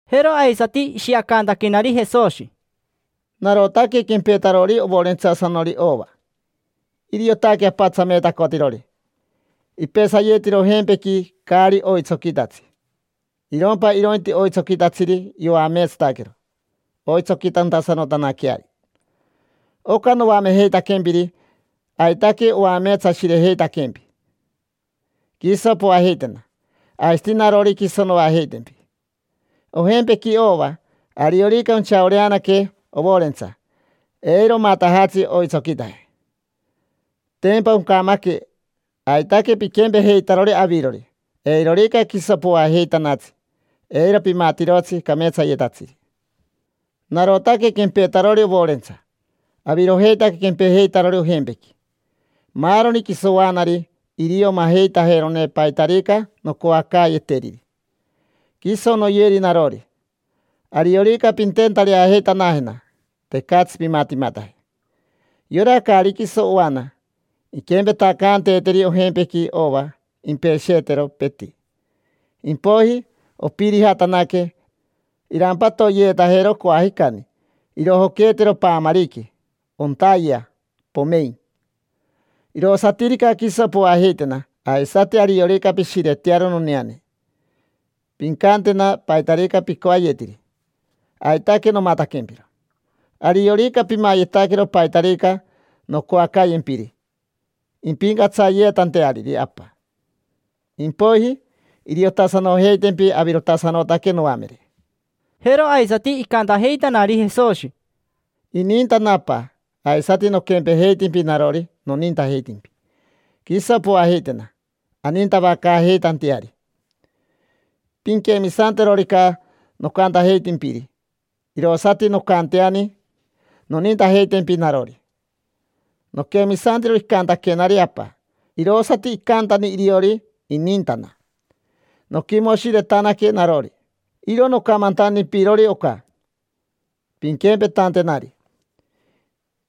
Jero aisati ishiacantaquenari Jesoshi: —Narotaque quempetarori ovorentsasanori ova. Iriotaque Apa tsameetacotirori. Ipesayetiro ojempequi caari oitsoquitatsi. Irompa irointi oitsoquitatsiri yoameetsataquero oitsoquitasanotantanaqueari. Oca noamejeitaquempiri, aitaque oameetsashirejeitaquempi. Quiso poajeitena. Aisati narori, quiso noajeitempi. Ojempequi ova, ariorica onchaoreanaque ovorentsa, eiro omatajatsi oitsoquitaje, tempa oncamaque. Aitaque piquempejeitarori avirori. Eirorica quiso poajeitanatsi, eiro pimatirotsi cameetsayetatsiri. Narotaque quempetarori ovorentsa. Avirojeitaque quempejeitarori ojempequi. Maaroni quiso oanari irio majeitajerone paitarica noncoacaayeteriri. Quiso noyeri narori. Ariorica pintentareajeitanajena, tecatsi pimatimataje. Yora caari quiso oana, inquempetacaanteeteri ojempequi ova, impesheetero, peti. Impoiji ompirijatanaque, irampatoyeetajero coajicani, irojoqueetero paamariqui, ontayea, pomein. Irosatirica quiso poajeitena, aisati ariorica pishiretearo noneane, pincantena paitarica picoayetiri: aitaque nomataquempiro. Ariorica pimayetaquero paitarica noncoacayempiri, impincatsayeetanteariri Apa. Impoiji iriotasanojeitempi avirotasanotaque noamere. Jero aisati icantajeitanari Jesoshi: —Inintana Apa. Aisati noquempejeitimpi narori, nonintajeitimpi. Quiso poajeitena, anintavacaajeitanteari. Pinquemisanterorica nocantajeitimpiri, irosati noncanteani nonintajeitempi narori. Noquemisantiro icantaquenari Apa, irosati icantani iriori, inintana. Noquimoshiretanaque narori. Iro nocamantantimpirori oca pinquempetantenari,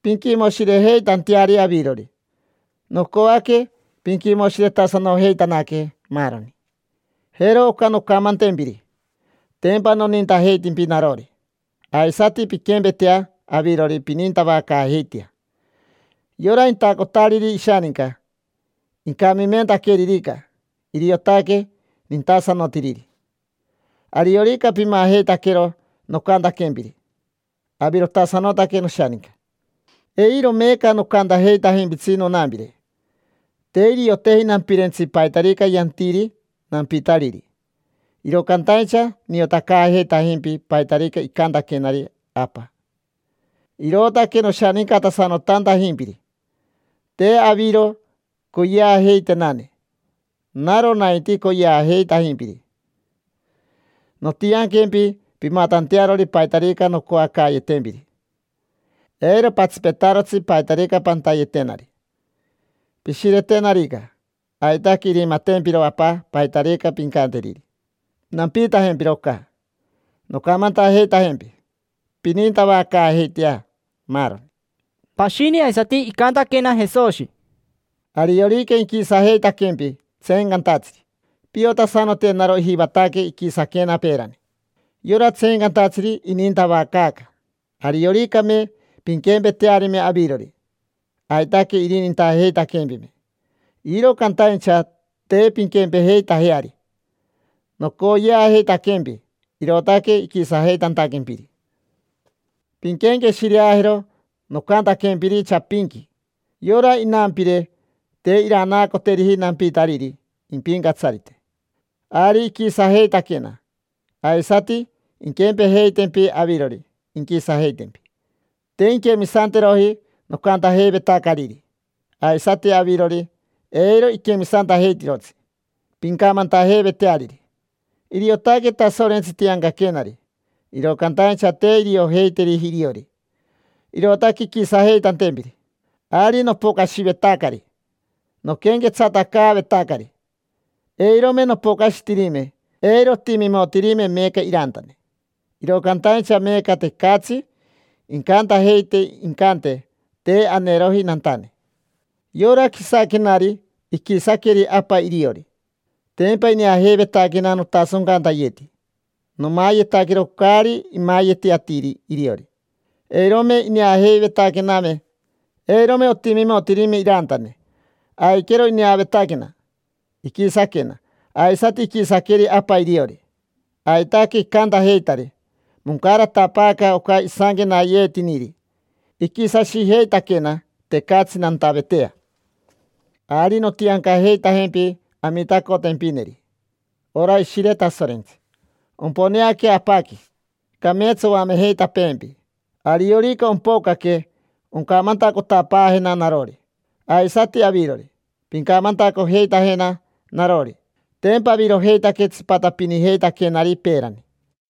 pinquimoshirejeitanteari avirori. Nocoaque pinquimoshiretasanojeitanaque maaroni. Jero oca noncamantempiri: tempa nonintajeitimpi narori. Aisati pinquempetea avirori, pinintavacaajeitea. Yora intacotariri ishaninca, incamimentaqueririca, iriotaque nintasanotiriri. Ariorica pimajeitaquero nocantaquempiri, avirotasanotaque noshaninca. Eiro meeca nocantajeitajimpitsi nonampire, te irioteji nampirentsi paitarica yantiri nampitariri. Iro cantaincha niotacaajeitajimpi paitarica icantaquenari Apa, irootaque noshanincatasanotantajimpiri. Te aviro coyeajeitenane; naro nainti coyeajeitimpiri. Nontianquempi pimatantearori paitarica noncoacaayetempiri. Eiro patsipetarotsi paitarica pantayetenari. Pishiretenarica, aitaque irimatempiro Apa paitarica pincanteriri. Nampiitajempiro oca noncamantajeitajempi: pinintavacaajeitea maaroni. Pashini aisati icantaquena Jesoshi: —Ariorica inquisajeitaquempi tseencantatsiri, piotasanote naro ijivataque iquisaquena peerani. Yora tseencantatsiri inintavacaaca. Arioricame pinquempetearime avirori, aitaque irinintajeitaquempime. Iro cantaincha te pinquempejeitajeari. Nocoyeajeitaquempi, irootaque iquisajeitantaquempiri. Pinquenqueshireajero nocantaquempiri chapinqui: “Yora inampire te iranaacoteriji nampitariri impincatsarite”. Ari iquisajeitaquena. Aisati inquempejeitempi avirori, inquisajeitempi. Te inquemisanteroji nocantajeivetacariri. Aisati avirori, eiro iquemisantajeitirotsi pincamantajeiveteariri. Iriotaque Tasorentsi tiancaquenari. Iro cantaincha te iriojeiteriji iriori, irootaque inquisajeitantempiri. Ari nopocashivetacari, noquenquetsatacaavetacari. Eirome nopocashitirime, eiro otimimotirime meeca irantane. Iro cantaincha meeca tecatsi incantajeite incante: “Te aneroji nantane”. Yora quisaquenari iquisaqueri Apa iriori. Tempa ineajeivetaquena notasoncantayeti. Nomayetaquero caari imayeti atiri iriori. Eirome ineajeivetaquename, eirome otimimotirime irantane. Aiquero ineavetaquena, iquisaquena. Aisati iquisaqueri Apa iriori. Aitaque icantajeitari. Moncaratapaaca oca isanquenayeetiniri: “Iquisashijeitaquena, tecatsi nantavetea”. Ari nontiancajeitajempi Amitacotempineri, ora Ishire Tasorentsi. Omponeaquea Apaqui, cameetsa oamejeitapeempi. Ariorica ompocaque oncamantacotapaajena narori. Aisati avirori, pincamantacojeitajena narori. Tempa avirojeitaque tsipatapinijeitaquenari peerani.